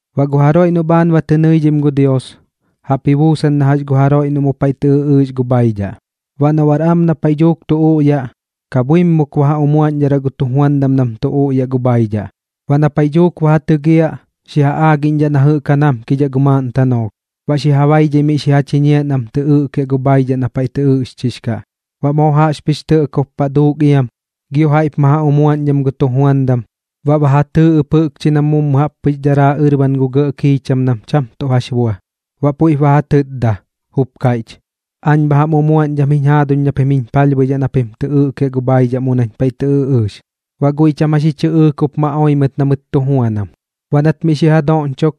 ’Baꞌ gu jaroiꞌ noꞌ bhaan ba tɨ nɨidhim gu Dios, jaꞌp ji buusan na jax gu jaroiꞌ noꞌ mu paiꞌ tɨ ɨꞌɨɨx gu bhaidhaꞌ. Baꞌ noꞌ bar am na paiꞌ dhuuk tu uꞌyaꞌ, kapbhuimuk ba ja umuaꞌñdharaꞌ gu tujuandam nam tu uꞌyaꞌ gu bhaidhaꞌ. Baꞌ na paiꞌ dhuuk ba ja tɨgiaꞌ, xi ja aagiꞌñdhaꞌ na jɨꞌk ja namkidhaꞌ gu maaꞌn tanoolh, baꞌ xi ja baidhai miꞌ xi ja chiñiaꞌ nam tɨ ɨꞌkiaꞌ gu bhaidhaꞌ na paiꞌ tɨ ɨꞌɨɨx kaꞌ. Baꞌ moo jaꞌxpɨx tɇꞌkob paꞌ duuk iam, gio jaiꞌp ma ja umuaꞌñdham gu tujuandam, baꞌ ba ja tɨɨ ɨp jɨꞌkchi nam mummu jaꞌp pɨx daraa ɨrban gu gɇꞌ kiicham nam cham tuꞌ jax bua. Baꞌ puiꞌp ba ja tɨtda, jup kaiꞌch: “Aañ bha jam umuaꞌñdham jiñ jaaduñ na pim jiñ palhbuidhaꞌ na pim tɨ ɨꞌkiaꞌ gu bhaidhaꞌ mu nañ paiꞌ tɨ ɨꞌɨɨx.” Baꞌ guiꞌ cham jax ji chɨꞌɨɨk jup ma oi mɨt na mɨt tu juanam. Baꞌ nat miꞌ xi ja doꞌñchok,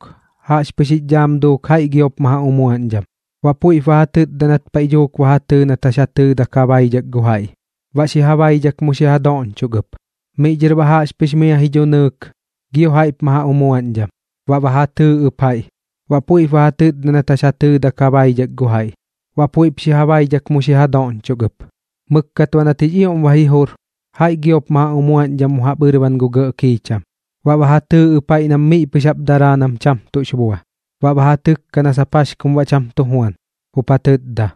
jaꞌxpɨx jix dhaam duuk jaiꞌ giop ma ja umuaꞌñdham. Baꞌ puiꞌp ba ja tɨtda nat paiꞌ dhuuk ba ja tɨɨ nat jax ja tɨɨdak ja baidhak gu jaiꞌ. Baꞌ xi ja baidhak mu xi ja doꞌñchok ɨp. Miꞌ dhɨr baꞌ jaꞌxpɨx mia ji dhunɨɨk, gio jaiꞌp ma ja umuaꞌñdham. Baꞌ ba ja tɨɨ ɨp jaiꞌ, baꞌ puiꞌp ba ja tɨtda nat jax ja tɨɨdak ja baidhak gu jaiꞌ. Baꞌ puiꞌp xi ja baidhak mu xi ja doꞌñchok ɨp. Mɨkkat baꞌ nat jix ioꞌm ba ji jur, jaiꞌ giop ma ja umuaꞌñdham mu jaꞌp ɨrban gu gɇꞌ kiicham. Baꞌ ba ja tɨɨ ɨp jaiꞌ nam miꞌ pɨx jaꞌp daraa nam cham tuꞌ jax bua. Baꞌ ba ja tɨkkaꞌ na sap jax kum baꞌ cham tu juan, jup ja tɨtda: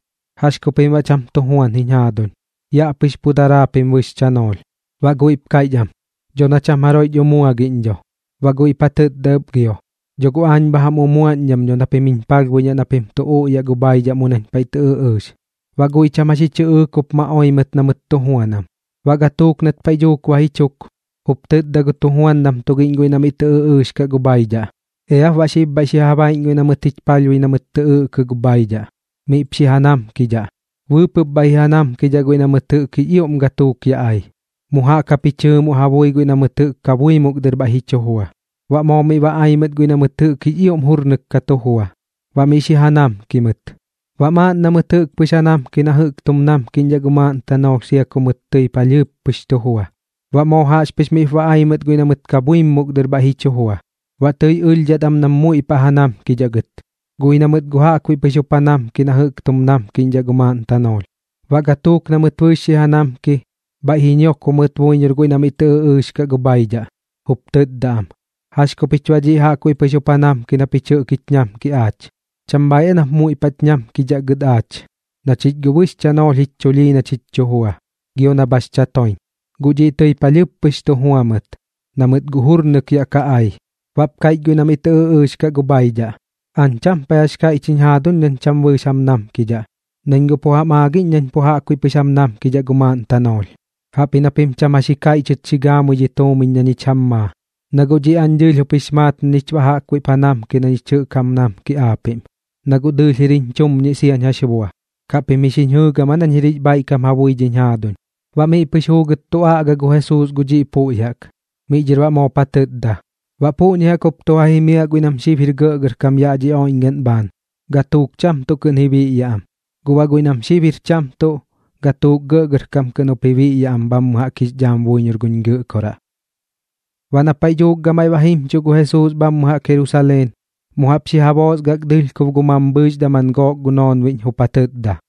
“¿Jax ku pim baꞌ cham tu juan jiñ jaaduñ? Yaꞌ pɨx pu daraa japim bɨx chanoolh.” Baꞌ guiꞌp kaiꞌch am: “Dho na cham jaroiꞌch umuagiꞌñ dho.” Baꞌ guiꞌp ja tɨtda ɨp gio: “Dho guꞌ aañ bha jam umuaꞌñdham dho na pim jiñ palhbuidhaꞌ na pim tu uꞌyaꞌ gu bhaidhaꞌ mu nañ paiꞌ tɨ ɨꞌɨɨx.” Baꞌ guiꞌ cham jax ji chɨꞌɨɨk jup ma oi mɨt na mɨt tu juanam. Baꞌ gatuuk nat paiꞌ dhuuk ba ji chuk, jup tɨtda gu tujuandam tugiꞌñ guiꞌ na miꞌ tɨ ɨꞌɨɨx kaꞌ gu bhaidhaꞌ: “Eap baꞌ xib bhaiꞌ xi ja baiꞌñ guiꞌ na mɨt jich palhbui na mɨt tɨ ɨꞌkɨ gu bhaidhaꞌ, miꞌp xi ja namkidhaꞌ. Bɨɨpɨꞌp bhaiꞌ ji ja namkidhaꞌ guiꞌ na mɨt jɨꞌk jix ioꞌm gatuuk yaꞌ ai, mu jaꞌk jap ji chɨɨmoꞌ ja bui guiꞌ na mɨt jɨꞌk kabuimuk dɨr bhaiꞌ ji chu jua.” Baꞌ moo miꞌ ba ai mɨt guiꞌ na mɨt jɨꞌk jix ioꞌm jurnɨk ka tu jua, baꞌ miꞌ xi ja namki mɨt. Baꞌ maaꞌn na mɨt jɨꞌk ja namki na jɨꞌk tum namkiꞌñdhaꞌ gu maaꞌn tanoolh sia ku mɨt tɨi palhɨɨp pɨx tu jua. Baꞌ moo jaꞌxpɨx miꞌp ba ai mɨt guiꞌ na mɨt kabuimuk dɨr bhaiꞌ ji chu jua. Baꞌ tɨi ɨlhdhat am nam muiꞌ paꞌ ja namkidhaꞌ gɨt, guꞌ ji na mɨt guꞌ jaꞌkbuiꞌ pɨx jup ja namki na jɨꞌk tum namkiꞌñdhaꞌ gu maaꞌn tanoolh. Baꞌ gatuuk na mɨt bɨɨx xi ja namki, bhaiꞌ ji ñiokbo mɨt buiñor guiꞌ na miꞌ tɨ ɨꞌɨɨx kaꞌ gu bhaidhaꞌ, jup tɨtda am: “¿Jax ku pich baꞌ dhiꞌ jaꞌkbuiꞌ pɨx jup ja namki na pich jɨꞌk jich ñamki aach? ¿Cham bhaaiꞌ aa nap muiꞌ paꞌch ñamkidhaꞌ gɨt aach, na chich guꞌ bɨx chanoolh jich chulhii na chich tu jua, gio na bhax chatoiñ? Guꞌ dhiꞌ tɨi palhɨɨp pɨx tu jua mɨt, na mɨt guꞌ jurnɨk yaꞌ ka ai.” Baꞌp kaiꞌch guiꞌ na miꞌ tɨ ɨꞌɨɨx kaꞌ gu bhaidhaꞌ: “Aañ cham paiꞌ jax kaiꞌch jiñ jaaduñ nañ cham bɨɨx jam namkidhaꞌ, nañ guꞌ pu jam aagiꞌñ nañ pu jaꞌkbuiꞌ pɨx jam namkidhaꞌ gu maaꞌn tanoolh. Jaꞌpji na pim cham jax ji kaiꞌchɨt xi gaamui dhi tuumiñ na ñich jam maa, na guꞌ dhiꞌ aañ dɨɨlh jup jix maat na ñich baꞌ jaꞌkbuiꞌp ja namki na ñich jɨꞌk jam namki aapiꞌm. Na guꞌ dɨɨlh jir jiñ chumñiꞌ siañ jax bua. ¿Kaꞌ pim ji xiñ jɨɨgam aa nañ jir jix bhaiꞌkam ja bui dhi jaaduñ?” Baꞌ miꞌ pɨx juugɨt tu aꞌga gu Jesuus gu dhiꞌ puꞌñi jaꞌk, miꞌ dhɨr baꞌ moop ja tɨtda: ―Baꞌ puꞌñi jaꞌk jup tu ja jimiaꞌ guiꞌ nam xib jir gɇꞌgɇrkam yaꞌ dhi oiꞌñgaꞌn bhaan, gatuuk cham tuꞌ kɨꞌn ji biꞌyaꞌ am. Guꞌ baꞌ guiꞌ nam xib jir cham tuꞌ, gatuuk gɇꞌgɇrkam kɨꞌn jup ji biꞌyaꞌ am jix dhaam jaꞌk buiñor guñ Gɨꞌkoraꞌ. Baꞌ na paiꞌ dhuuk gamaiꞌ ba jimchuꞌ gu Jesuus bhammɨ jaꞌk Jerusaleen, mu jaꞌp xi ja boosgak dɨlhkob gu mambhɨɨx daman gook noonbiꞌñ, jup ja tɨtda: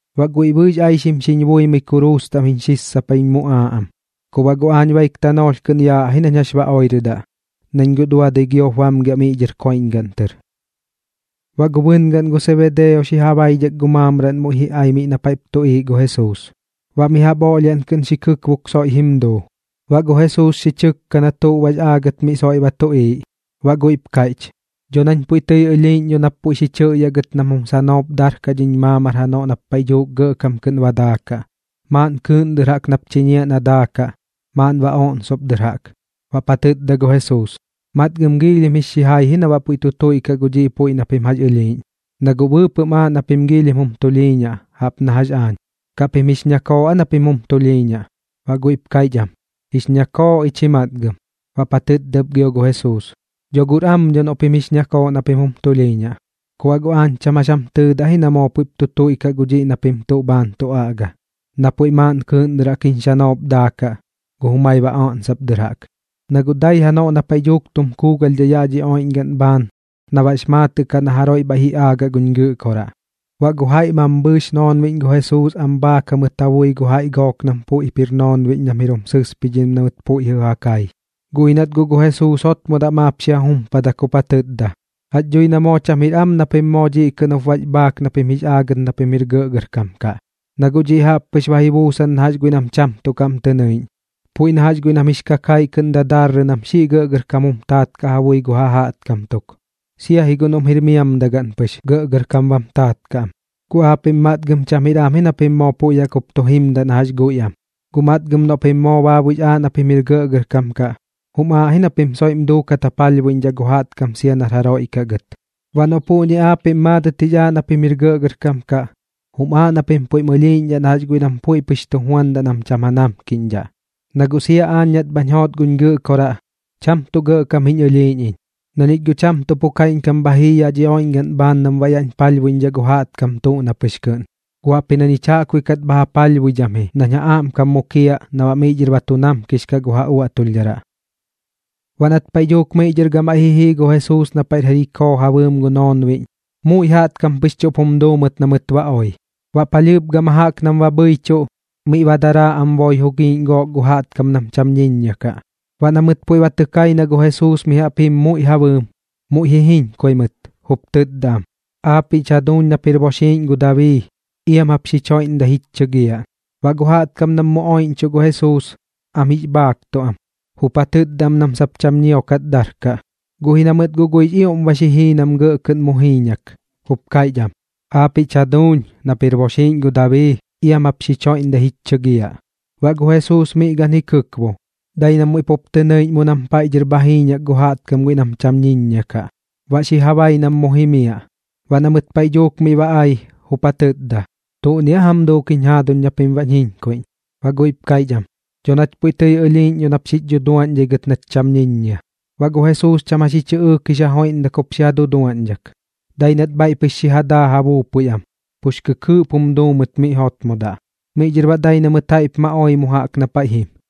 Baꞌ guiꞌ bɨɨx aixim xiñ buimɨi kuruus taꞌm jiñ sissapai xiñ muꞌaaꞌ am. Ku baꞌ guꞌ aañ baik tanoolh kɨꞌn yaꞌ ji nañ jax ba oirɨdaꞌ, nañ guꞌ duadɨi giop bamgiaꞌ miꞌ dhɨr koiꞌñgaꞌn tɨr. Baꞌ gu bɨngaꞌn gu Sebedeo xi ja baidhak gu maamraꞌn muiꞌ ji ai miꞌ na paiꞌp tuꞌiiꞌ gu Jesuus, baꞌ mi jaꞌp oꞌlhiaꞌn kɨꞌn xi kɨkbok soiꞌ jim duu. Baꞌ gu Jesuus xi chɨkka na tuꞌ baꞌx aagɨt miꞌ soiꞌ ba tuꞌiiꞌ, baꞌ guiꞌp kaiꞌch: ―Dho nañ puiꞌ tɨi ɨlhiiꞌñ dho nap puiꞌ xi chɨꞌyaꞌ gɨt nam jum sanoop darkaꞌ dhiñ maamar janoꞌ nap paiꞌ dhuuk gɇꞌkam kɨꞌn ba daakaꞌ, maaꞌn kɨɨꞌn dɨr jaꞌk nap chiñiaꞌ na daakaꞌ, maaꞌn baꞌ oꞌnsop dɨr jaꞌk. Baꞌp ja tɨtda gu Jesuus: ―Matgɨm giilhim jix xijai ji na baꞌ puiꞌ tu tuiꞌkaꞌ gu dhiꞌ puiꞌ na pim jax ɨlhiiꞌñ, na guꞌ bɨɨpɨꞌm aaꞌ na pim giilhim jum tulhiiñaꞌ, jaꞌp na jax aañ. ¿Kaꞌ pim jix ñakooꞌ aa na pim jum tulhiiñaꞌ? Baꞌ guiꞌp kaiꞌch am: ―Jix ñakooꞌ ich ji matgɨm. Baꞌp ja tɨtda ɨp gio gu Jesuus: ―Dho guꞌr am dho noꞌ pim guꞌx ñakooꞌ na pim jum tulhiiñaꞌ. Ku baꞌ guꞌ aañ cham jax jam tɨɨdaꞌ ji na moo puiꞌ tu tuiꞌkaꞌ gu dhiꞌ na pim tuꞌ bhaan tu aꞌga, na puiꞌ maaꞌn kɨɨꞌn dɨr jaꞌk jiñ xanoop daakaꞌ, gu jumai baꞌ oꞌnsop dɨr jaꞌk. Na guꞌ dai janoꞌ na paiꞌ dhuuk tum kuugalhdhaꞌ yaꞌ dhi oiꞌñgaꞌn bhaan na baꞌx maatɨꞌ kaꞌ na jaroiꞌ bhaiꞌ ji aagaꞌ guñ Gɨꞌkoraꞌ. Baꞌ gu jaiꞌ mambhɨɨx noonbiꞌñ gu Jesuus am bhaak jamɨt ja bui gu jaiꞌ gook nam puiꞌp jir noonbiꞌñ nam jir jum sɨspidhim na mɨt puiꞌ jɨꞌ ja kai. Guꞌ ji nat guꞌ gu Jesuus jotmodaꞌ maap xi ja jumpadak jup ja tɨtda: ―Jax dhui na cham jir am na pim moo kɨꞌn jup bax bhaak na pim jix aagɨt na pim jir gɇꞌgɇrkam kaꞌ. Na guꞌ dhiꞌ jaꞌp pɨx ba ji buusan na jax guiꞌ nam cham tuꞌ kaꞌm tɨ nɨiꞌñ, puiꞌ na jax guiꞌ nam jix kakaiꞌ kɨꞌn dadarrɨ nam xiꞌ gɇꞌgɇrkam jum taat kaꞌ ja bui gu ja jaꞌtkam tuk, sia ji guꞌ noꞌm jir miamdagaꞌn pɨx, gɇꞌgɇrkam bam taat kaꞌ am. Guꞌ aapiꞌm matgɨm cham jir am ji na pim moo puiꞌ jaꞌk jup tu jimdaꞌ na jax guiꞌ am. Guꞌ matgɨm noꞌ pim moo baabuiꞌx aaꞌ na pim jir gɇꞌgɇrkam kaꞌ, jum aaꞌ ji na pim soiꞌm duukat ja palhbuiꞌñdhaꞌ gu jaꞌtkam sia nar jaroiꞌ kaꞌ gɨt. Baꞌ noꞌ puꞌñi aapiꞌm maadɨt jix aaꞌ na pim jir gɇꞌgɇrkam kaꞌ, jum aaꞌ na pim puiꞌm ɨlhiiꞌñdhaꞌ na jax guiꞌ nam puiꞌ pɨx tu juandaꞌ nam cham ja namkiꞌñdhaꞌ. Na guꞌ sia aañ nat bhañ joot guñ Gɨꞌkoraꞌ, cham tuꞌ gɇꞌkam jiñ ɨlhiiꞌñ iñ, na ñich guꞌ cham tuꞌ pu kaiꞌñkam bha jii yaꞌ dhi oiꞌñgaꞌn bhaan nam baꞌ yaꞌñ palhbuiꞌñdhaꞌ gu jaꞌtkam tuꞌ na pɨx kɨꞌn. Guꞌ jaꞌpji na ñich jaꞌkbuiꞌ kat bha ja palhbuidham ji nañ ja aꞌmkam mukiaꞌ na baꞌ miꞌ dhɨr ba tu namkix kaꞌ gu ja uaꞌtulhdharaꞌ. Baꞌ nat paiꞌ dhuuk miꞌ dhɨr gamaiꞌ ji jii gu Jesuus na paiꞌr Jerikoo ja bɨɨm gu noonbiꞌñ, muiꞌ jaꞌtkam pɨx chuꞌp jum duu mɨt na mɨt ba oi. Baꞌ palhɨɨp gama jaꞌk nam ba bhɨichuꞌ, miꞌ ba daraa am boi jugiiꞌñ gook gu jaꞌtkam nam cham ñiññia kaꞌ. Baꞌ na mɨt puiꞌ ba tɨ kai na gu Jesuus mi jaꞌp jim muiꞌ ja bɨɨm, muiꞌ ji jiñkui mɨt, jup tɨtda am: ―¡Aapiꞌ jich jaduuñ nap jir boxiiꞌñ gu Dabii, iam jap xich joiꞌmdai jich chɨgiaꞌ! Baꞌ gu jaꞌtkam nam muiꞌp oiꞌñchuꞌ gu Jesuus, am jix bhaaktuꞌ am, jup ja tɨtda am nam sap cham ñiokat darkaꞌ. Guꞌ ji na mɨt guꞌ guiꞌx ioꞌm ba xi jii nam gɇꞌ kɨꞌn mu jiiñak, jup kaiꞌch am: ―¡Aapiꞌ jich jaduuñ nap jir boxiiꞌñ gu Dabii, iam jap xich joiꞌmdai jich chɨgiaꞌ! Baꞌ gu Jesuus miꞌ gan ji kɨkbo, dai na muiꞌ pup tɨ nɨiꞌñ mu nam paiꞌ dhɨr bha jiiñak gu jaꞌtkam guiꞌ nam cham ñiññia kaꞌ, baꞌ xi ja bai nam mu jimiaꞌ. Baꞌ na mɨt paiꞌ dhuuk miꞌ ba ai, jup ja tɨtda: ―¿Tuꞌni aa jam duuk jiñ jaaduñ na pim baꞌ bhañ jiñkuiꞌñ? Baꞌ guiꞌp kaiꞌch am: ―Dho nach puiꞌ tɨi ɨlhiiꞌñ dho nap xich dhuduaꞌñdhai gɨt nach cham ñiññia. Baꞌ gu Jesuus cham jax ji chɨꞌɨɨk jix ja joiꞌmdak jup xi ja duduaꞌñdhak, dai nat bhaiꞌ pɨx xi ja daa ja buupui am, pux kɨkɨɨꞌp jum duu mɨt miꞌ jotmodaꞌ. Miꞌ dhɨr baꞌ dai na mɨt jaiꞌp ma oi mu jaꞌk na paiꞌ jim.